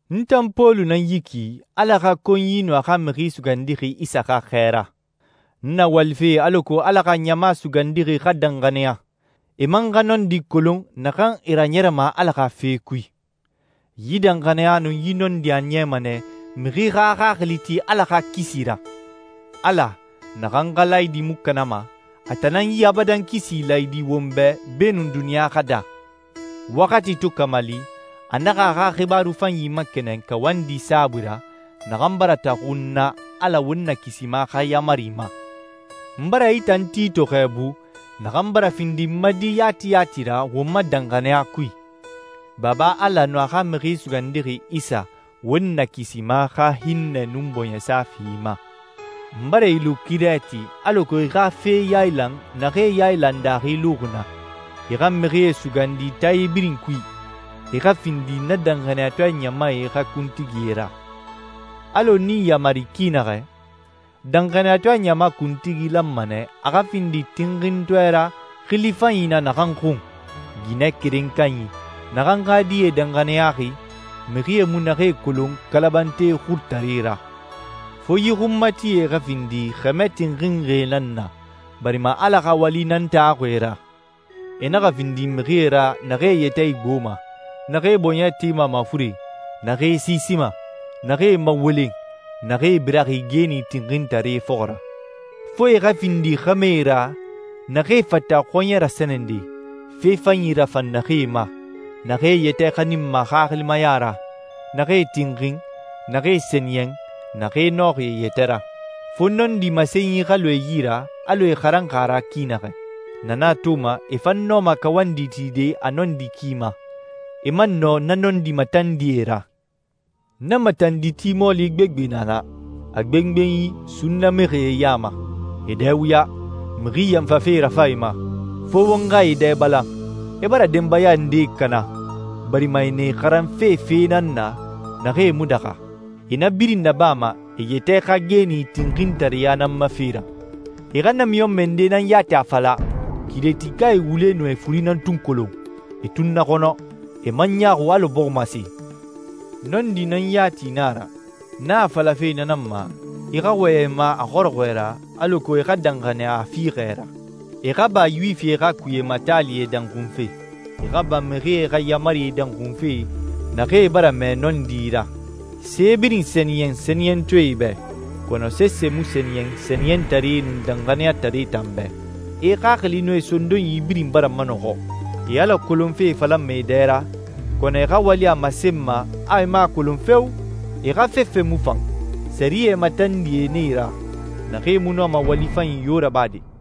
N tan Pɔlu nan yi ki, Ala xa konyi nun a xa Mixi Sugandixi Isa xa xɛɛra. N na walife alako Ala xa ɲama sugandixi xa danxaniya, e man xa nɔndi kolon naxan e raɲɛrɛma Ala xa fe kui. Yi danxaniya nun yi nɔndi a niyama nɛ mixi xa a xaxili ti Ala xa kisi ra. Ala, naxan xa laayidi mu kanama, a tan nan yi abadan kisi laayidi won bɛ beenun duniɲa xa daa. Waxati to kamali, a naxa a xa xibaaru fanyi makɛnɛn kawandi saabui ra, naxan bara taxu n na Ala won Nakisima xa yaamari ma. N bara i tan Tito xɛɛbu, naxan bara findi n ma di yati yati ra won ma danxaniya kui. Baba Ala nun a xa Mixi Sugandixi Isa, won Nakisima xa hinnɛ nun bɔɲɛsa fi i ma. N bara i lu Kirɛti alako i xa fee yailan naxee yailan daaxi luxi na, i xa mixie sugandi taae birin kui, e xa findi na danxaniyatɔɛ ɲamae xa kuntigie ra. Alɔ n i yamari ki naxɛ, danxaniyatɔɛ ɲama kuntigi lanma nɛ a xa findi tinxintɔɛ ra xili fanyi na naxan xun, ginɛ keren kanyi, naxan xa die danxaniyaxi, mixie mu naxee kolon kalabante xurutaree ra. Fo yi xunmatie xa findi xɛmɛ tinxinxie nan na barima Ala xa wali nan taxuxi e ra. E naxa findi mixie ra naxee e yɛtɛ igboma, naxee bɔɲɛ tema mafuren, naxee siisima, naxee mawolen, naxee biraxi geeni tinxintare fɔxɔ ra. Fo e xa findi xɛmɛe ra naxee fata xɔɲɛ rasɛnɛde, fe fanyi rafan naxee ma, naxee e yɛtɛ xaninma xaxilimaya ra, naxee tinxin, naxee sɛniyɛn, naxee nɔxi e yɛtɛ ra. Fo nɔndi masenyi xa lu e yi ra alɔ e xaranxi a ra ki naxɛ. Na nan a toma e fan nɔma kawandi tide a nɔndi ki ma, e man nɔ na nɔndi matandie ra. Na matanditi mɔɔli gbegbe na na, a gbengbenyi sunna mixie ya ma. E dɛ wuya, mixi yanfafe rafan e ma. Fo won xa e dɛ balan. E bara denbaya ndee kana, barima e na e xaranfe fee nan na naxee mu daxa. E na birin nabama e yɛtɛ xa geeni tinxintareya nan ma fe ra. E xa namiɲɔnmɛ nde nan yati a fala, «Kirɛtikae wule nun e furi nan tun kolon. E tunnaxɔnɔ, e man ɲaaxu alɔ bɔximase.» Nɔndi nan yati na a ra. N na a falafe na nan ma, i xa wɔyɛn e ma a xɔrɔxɔɛ ra alako e xa danxaniya a fiixɛ ra, e xa ba Yuwifi xa kuye taalie danxunfe. E xa ba mixie xa yaamarie danxunfe naxee bara mɛɛ nɔndi ra. Se birin sɛniyɛn sɛniyɛntɔɛe bɛ, kɔnɔ sese mu sɛniyɛn sɛniyɛntaree nun danxaniyataree tan bɛ. E xaxili nun e sondonyi birin bara manɔxɔ. E Ala kolonfe falama e dɛ ra, kɔnɔ e xa wali a masenma a e mu a kolon feo! E xa fefe mu fan. Sɛriyɛ matandie nan e ra, naxee mu nɔma wali fanyi yo rabade.